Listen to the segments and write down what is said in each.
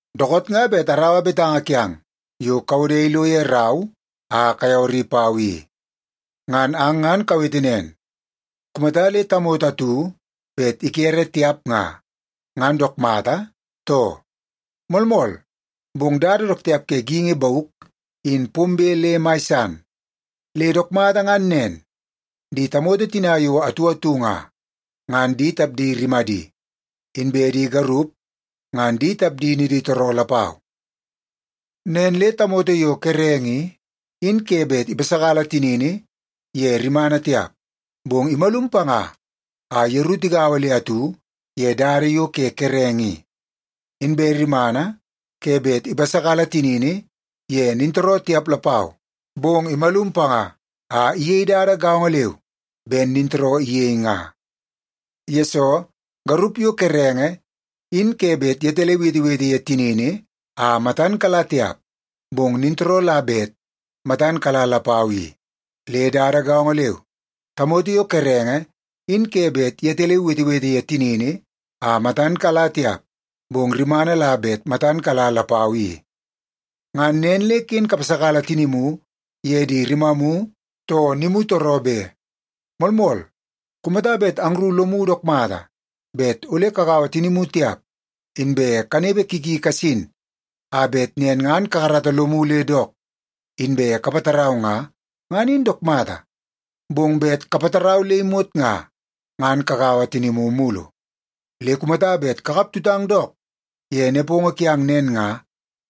Dookoot nga bet araua betanga kiang yo kawode ilo ye rau a kayawari pau i. Ngan ang ngan kawete nen, kumata le tamoto atu bet ikere tiap nga, ngan dook mata, too? Moolmool, bong dada dook tiap ke geingi bauk in pombe le mai san, le dook mata ngan nen, di tamoto tina yo atu atu nga, ngan di tapdi rimadi, inbe di garup ngan di tapdi niditooroo lapau. Nen le tamoto yo kerenge i, in ke bet ipasakala tinini ye rimana tiap, bong imalum panga a yeru tigaua le atu ye dada yo ke kerenge i. Inbe rimana ke bet ipasakala tinini ye nintooroo tiap lapau, bong imalum panga a iyei dada gaongo leu ben nintooroo iyei nga. Yesoo, garup yo kerenge in ke bet yetaleu iwetewete ye tinini a matan kala tiap, bong nintooroo la bet matan kala lapau i. Le dada gaongo leu, tamoto yo kerenge in ke bet yetaleu iwetewete ye tinini a matan kala tiap, bong rimana la bet matan kala lapau i. Ngan nen le ken kapasakala tinimu ye di rimamu too nimutooroo be. Moolmool, kumata bet angru lomu dook mata bet ole kagaua tinimu tiap, inbe kanepe ki ki kasin a bet nen ngan kakarata lomu le dook inbe kapatarau nga, ngan in dook mata. Bong bet kapatarau le imot nga, ngan kagaua tinimu mulu. Le kumata bet kakap tutang dook ye nepongo kiang nen nga,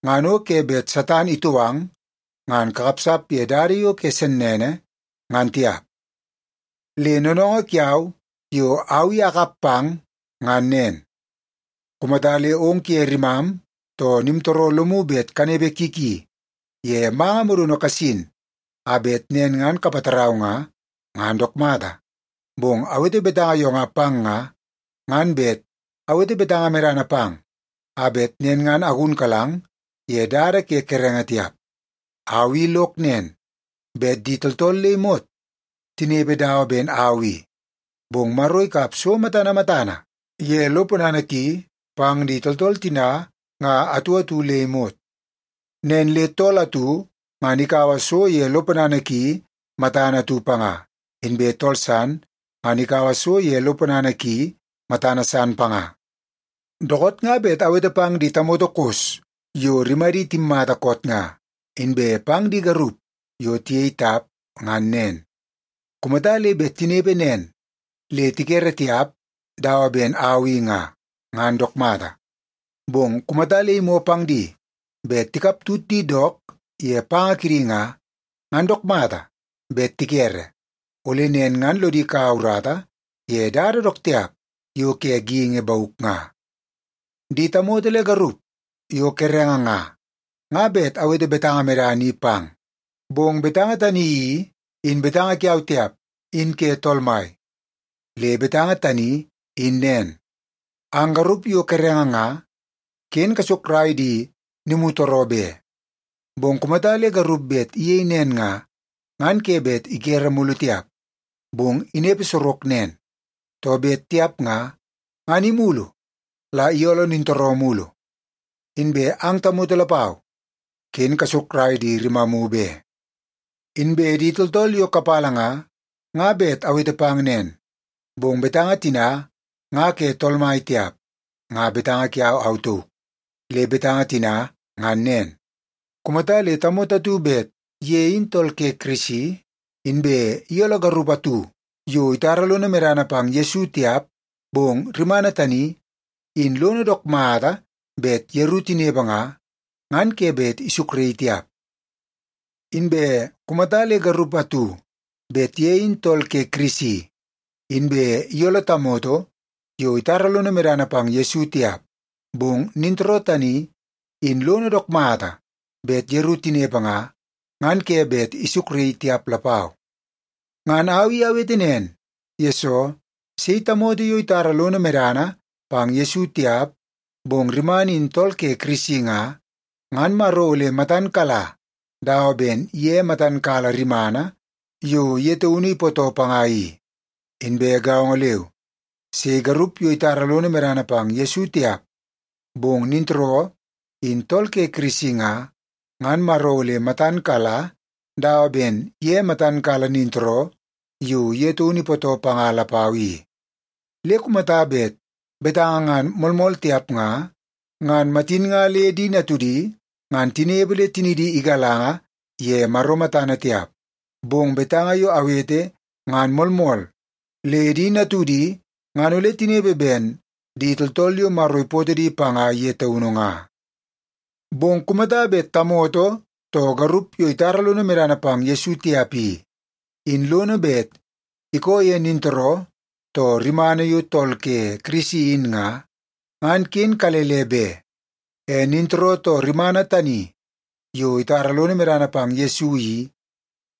ngan o ke bet Satan itou ang ngan kakapsap ye dada yo ke sennene, ngan tiap. Le noonoongoo kiau yo au i akap pang ngan nen: Kumata le ong kuye rimam too nimtooroo lomu bet kanepe ki ki ye manga modono kasin a bet nen ngan kapatarau nga, ngan dook mata. Bong awete betanga yo nga pang nga, ngan bet awete betanga medana pang a bet nen ngan agunkalang ye dada ke kerenge tiap. Au i lok nen, bet di tooltool le imot tinepe dawa ben au i. Bong Maro ikap so matana matana ye lo ponana ki pang di tooltool tina nga atu atu le imot. Nen le tool atu ngan ikaua so ye lo ponana ki matana atu panga, inbe tool san ngan ikaua so ye lo ponana ki matana san panga. Dookoot nga bet awete pang di tamoto kos yo rimadi timmata koot nga, inbe pang di garup yo tiyei tap ngan nen. Kumata le bet tinepe nen le tikere tiap dawa ben au i nga, ngan dook mata. Bong kumata le imoo pang di bet tikap tut di dook ye panga kidi nga, ngan dook mata bet tikere, ole nen ngan lodi kaua urata ye dada dook tiap yo ke geingi bauk nga. Di tamoto le garup yo kerenge nga, nga bet awete betanga medana i pang. Bong betanga tani i, in betanga kiau tiap, in ke Tool Mai. Le betanga tani in nen: Ang garup yo kerenge nga, ken kasukrai di nimutooroo be. Bong kumata le garup bet iyei nen nga, ngan ke bet ikere mulu tiap, bong inepe sorok nen. Too bet tiap nga, ngan imulu la iyooloo nintooroo mulu. Inbe ang tamoto lapau, ken kasukrai di rimamu be. Inbe di tooltool yo kapala nga, nga bet awete pang nen. Bong betanga tina nga ke Tool Mai tiap, nga betanga kiau au tauk. Le betanga tina ngan nen: Kumata le tamoto atu bet ye in tool ke Kirisi, inbe iyooloo garup atu yo itara lono medana pang Yesu tiap, bong rimana tani in lono dook mata bet yeru tinepe nga, ngan ke bet isukraii tiap. Inbe kumata le garup atu bet ye in tool ke Kirisi, inbe iyooloo tamoto yo itara lono medana pang Yesu tiap, bong nintooroo tani in lono dook mata bet yeru tinepe nga, ngan ke bet isukraii tiap lapau. Ngan au i awete nen, yesoo sei tamoto yo itara lono medana pang Yesu tiap, bong rimana in tool ke Kirisi nga, ngan Maro ole matan kala dawa ben ye matan kala rimana yo ye taunu ipootoo panga i. Inbe gaongo leu, sei garup yo itara lono medana pang Yesu tiap, bong nintooroo in tool ke Kirisi nga, ngan Maro ole matan kala dawa ben ye matan kala nintooroo yo ye taunu ipootoo panga lapau i. Le kumata bet betanga ngan moolmool tiap nga, ngan matin nga le di natudi ngan tinepe le tinidi igalanga ye Maro matana tiap. Bong betanga yo awete ngan moolmool le di natudi ngan ole tinepe ben di tooltool yo Maro ipootoo di panga ye taunu nga. Bong kumata bet tamoto too garup yo itara lono medana pang Yesu tiap i, in lono bet ikoo ye nintooroo too rimana yo tool ke Kirisi in nga, ngan ken kalele be. E nintooroo too rimana tani yo itara lono medana pang Yesu i,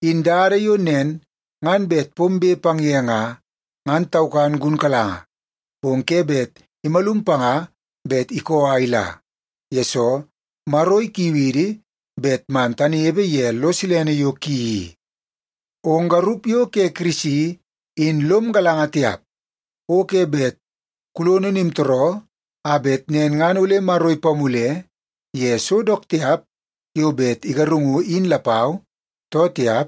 in dada yo nen ngan bet pombe pang ye nga, ngan taukan gunkalanga, bong ke bet imalum panga bet ikoo a ila, yesoo Maro ikiu idi bet man tanepe ye lo silene yo ki i. Ong garup yo ke Kirisi in lom galanga tiap, o ke bet kulono nimtooroo a bet nen ngan ole Maro ipamule ye so dook tiap yo bet igarungu in lapau, too tiap?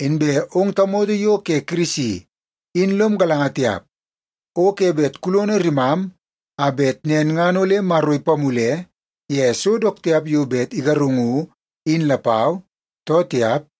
Inbe ong tamoto yo ke Kirisi in lom galanga tiap, o ke bet kulono rimam a bet nen ngan ole Maro ipamule ye so dook tiap yo bet igarungu in lapau, too tiap?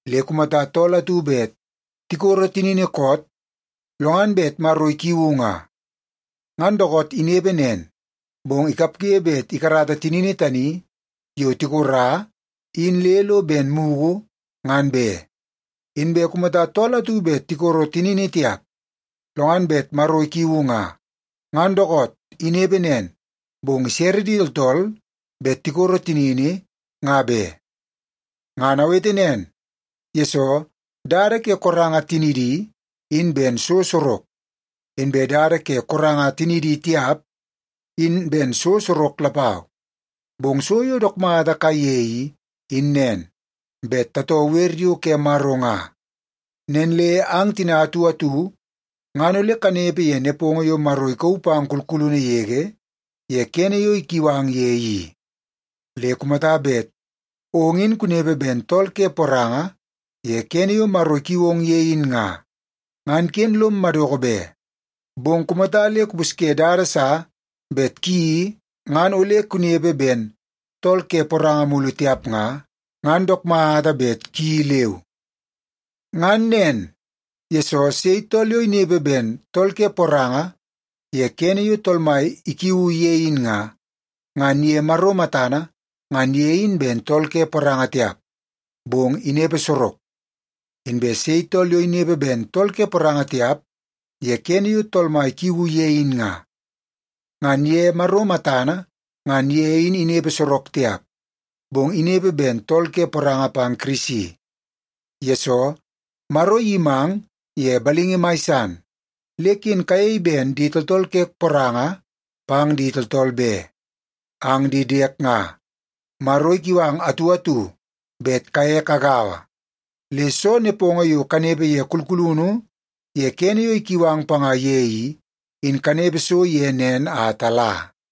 Le kumata tool atu bet tikoro tinini koot lo ngan bet Maro ikiuu nga, ngan dookoot inepe nen, bong ikapge bet ikarata tinini tani yo tikora in le lo ben mugu ngan be. Inbe kumata tool atu bet tikoro tinini tiap, lo ngan bet Maro ikiuu nga, ngan dookoot inepe nen, bong isere di tooltool bet tikoro tinini nga be. Ngan awete nen, yesoo dada ke koranga tinidi, in ben so sorok. Inbe dada ke koranga tinidi tiap, in ben so sorok lapau. Bong so yo dook mata kaiye i, in nen; bet tatoo wer yo ke Maro nga. Nen le ang tina atu atu ngan ole kanepe ye nepongo yo Maro ikauu pang kulkulunu yege ye kene yo ikiu ang ye i. Le kumata bet ong in kunepe ben tool ke poranga ye kene yo Maro ikiu ong ye in nga, ngan ken lom madoko be. Bong kumata le kupusye dada sa bet kuyeii ngan ole kunepe ben tool ke poranga mulu tiap nga, ngan dook mata bet kuyeii leu. Ngan nen, yesoo sei tool yo inepe ben tool ke poranga ye kene yo Tool Mai ikiuu ye in nga, ngan ye Maro matana ngan ye in ben tool ke poranga tiap, bong inepe sorok. Inbe sei tool yo inepe ben tool ke poranga tiap ye kene yo Tool Mai ikiuu ye in nga, ngan ye Maro matana ngan ye in inepe sorok tiap, bong inepe ben tool ke poranga pang Kirisi. Yesoo, Maro iyimang ye balingi mai san, le ken kayei ben di tooltool ke poranga pang di tooltool be. Ang di diek nga, Maro ikiu ang atu atu bet kaye kagaua. Le soo nepongo yo kanepe ye kulkulunu ye kene yo ikiu ang panga ye i, in kanepe so ye nen a tala.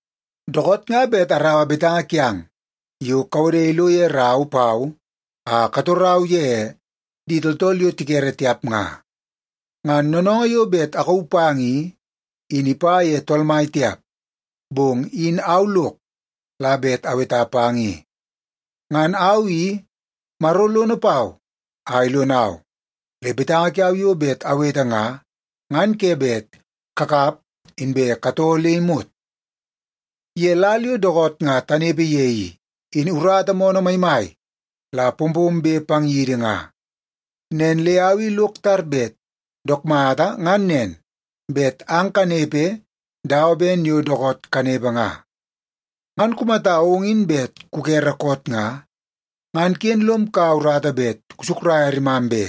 Dookoot nga bet araua betanga kiang yo kawode ilo ye rau pau a katorau ye di tooltool yo tikere tiap nga. Ngan noonoongoo yo bet akauu pang i, in ipa ye Tool Mai tiap, bong in au lok la bet aweta pang i. Ngan au i, Maro lono pau a ilonau, le betanga kiau yo bet awete nga, ngan ke bet kakap inbe katoo le imot. Ye lal yo dookoot nga tanepe ye i, in urata moonoo maimai la pompombe pang yidi nga. Nen le au i lok tar bet dook mata ngan nen, bet ang kanepe dawa ben yo dookoot kanepe nga. Ngan kumata ong in bet kukere koot nga, ngan ken lom kaua urata bet kusukraia rimam be.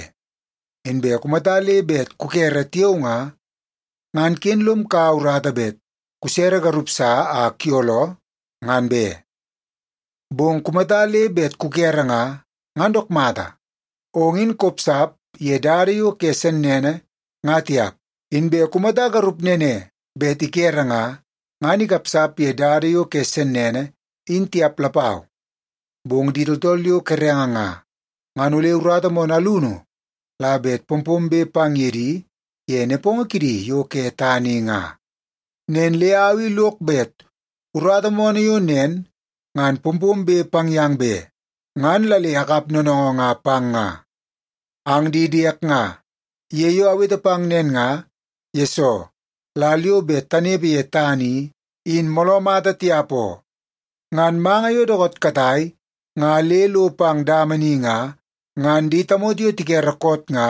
Inbe kumata le bet kukere tiao nga, ngan ken lom kaua urata bet kusere garup sa a kuyooloo, ngan be. Bong kumata le bet kukere nga, ngan dook mata, ong in kopsap ye dada yo ke sennene nga tiap. Inbe kumata garup nene bet ikere nga, ngan ikapsap ye dada yo ke sennene in tiap lapau. Bong di tooltool yo kerenge nga, ngan ole urata moonoo alunu la bet pompombe pang ye di ye nepongo kidi yo ke tana i nga. Nen le au i lok bet urata moonoo yo nen ngan pompombe pang yang be, ngan la le akap noonoongoo nga pang nga. Ang di diek nga, ye yo awete pang nen nga, yesoo lal yo bet tanepe ye tana i, in mooloo mata tiap oo. Ngan manga yo dookoot katai nga le lo pang dama ni nga, ngan di tamoto yo tikere koot nga,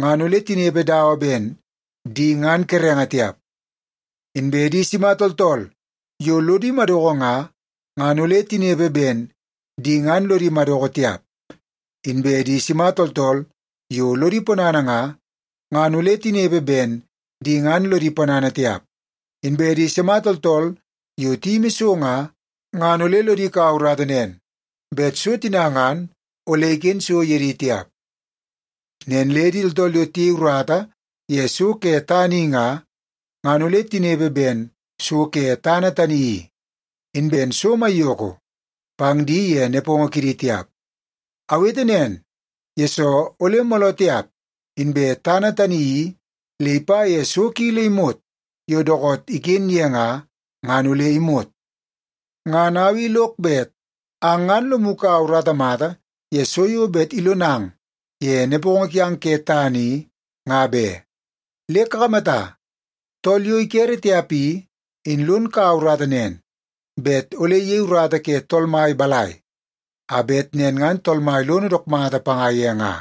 ngan ole tinepe dawa ben di ngan kerenge tiap. Inbe di sima tooltool yo lodi madoko nga, ngan ole tinepe ben di ngan lodi madoko tiap. Inbe di sima tooltool yo lodi ponana nga, ngan ole tinepe ben di ngan lodi ponana tiap. Inbe di sima tooltool yo tiyimi so nga, ngan ole lodi kaua urata nen bet so tina ngan ole iken so ye di tiap. Nen le di tooltool yo tiyei urata ye so ke tana i nga, ngan ole tinepe ben so ke tana tani i, in ben so maiyoko pang di ye nepongo kidi tiap. Awete nen, yesoo ole mooloo tiap, inbe tana tani i le ipa ye so ki le imot yo dookoot iken ye nga, ngan ole imot. Ngan au i lok bet ang ngan lomu kaua urata mata ye so yo bet ilonang ye nepongo kiang ke tana i, nga be. Le kakamata, tool yo ikere tiap i, in lon kaua urata nen, bet ole iyei urata ke Tool Mai balai, a bet nen ngan Tool Mai lono dook mata panga ye nga.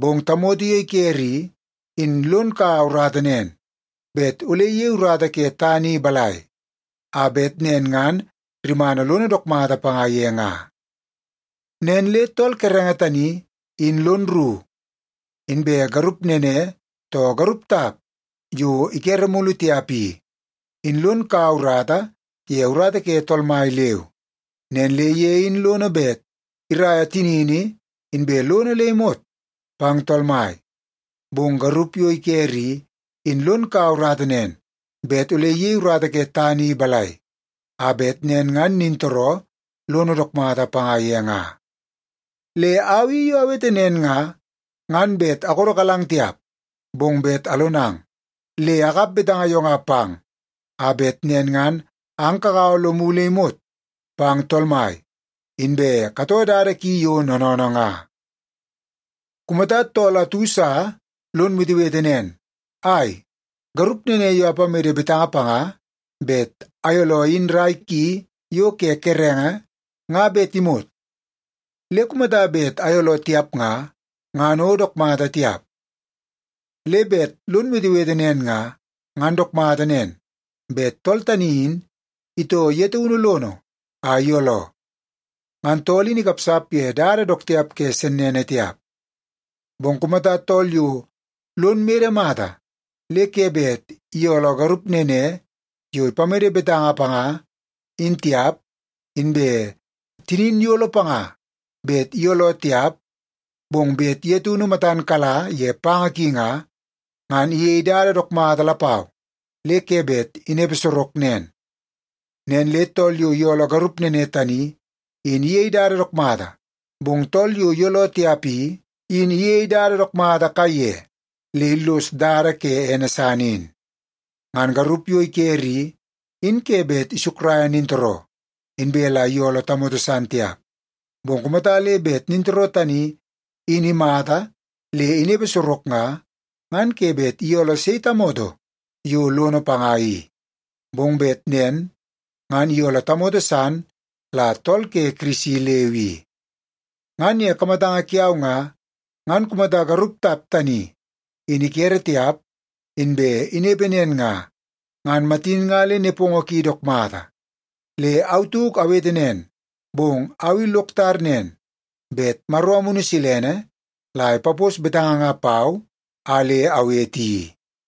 Bong tamoto yo ikere i, in lon kaua urata nen, bet ole iyei urata ke tana i balai, a bet nen ngan rimana lono dook mata panga ye nga. Nen le tool kerenge tani in lon rru. Inbe garup nene, too garup tap yo ikere mulu tiap i, in lon kaua urata ye urata ke Tool Mai leu. Nen le ye in lono bet iraia tinini inbe lono le imot pang Tool Mai. Bong garup yo ikere i, in lon kaua urata nen, bet ole iyei urata ke tana i balai, a bet nen ngan nintooroo lono dook mata panga ye nga. Le au i yo awete nen nga, ngan bet akodokalang tiap, bong bet alonang. Le akap betanga yo nga pang, a bet nen ngan ang kagaua lomu le imot pang Tool Mai, inbe katoo dada ki yo noonoonoo nga. Kumata tool atu sa lon wetewete nen, “Ai, garup nene yo apamede betanga panga bet ayooloo in rai ki yo ke kerenge nga bet imot. Le kumata bet ayooloo tiap nga, ngan o dook mata tiap.” Le bet lon wetewete nen nga, ngan dook mata nen bet tool tani in itoo ye taunu lono a iyooloo. Ngan tool in ikapsap ye dada dook tiap ke sennene tiap. Bong kumata tool yo lon mede mata le ke bet iyooloo garup nene yo ipamede betanga panga in tiap, inbe tinin iyolo panga bet iyooloo tiap, bong bet ye taunu matan kala ye panga ki nga, ngan iyei dada dook mata lapau le ke bet inepe sorok nen. Nen le tool yo iyooloo garup nene tani, in iyei dada dook mata, bong tool yo iyooloo tiap i, in iyei dada dook mata kaiye le illoso dada ke ene san in. Ngan garup yo ikere i, in ke bet isukraia nintooroo, inbe la iyooloo tamoto san tiap. Bong kumata le bet nintooroo tani in imata le inepe sorok nga, ngan ke bet iyooloo sei tamoto yo lono panga i. Bong bet nen ngan iyooloo tamoto san la tool ke Kirisi leu i. Ngan ye kamatanga kiau nga, ngan kumata garup tap tani in ikere tiap, inbe inepe nen nga, ngan matin nga le nepongo ki dook mata. Le au tauk awete nen, bong au i lok tar nen bet Maro Amunu Silene la ipapos betanga nga pau a le awete i.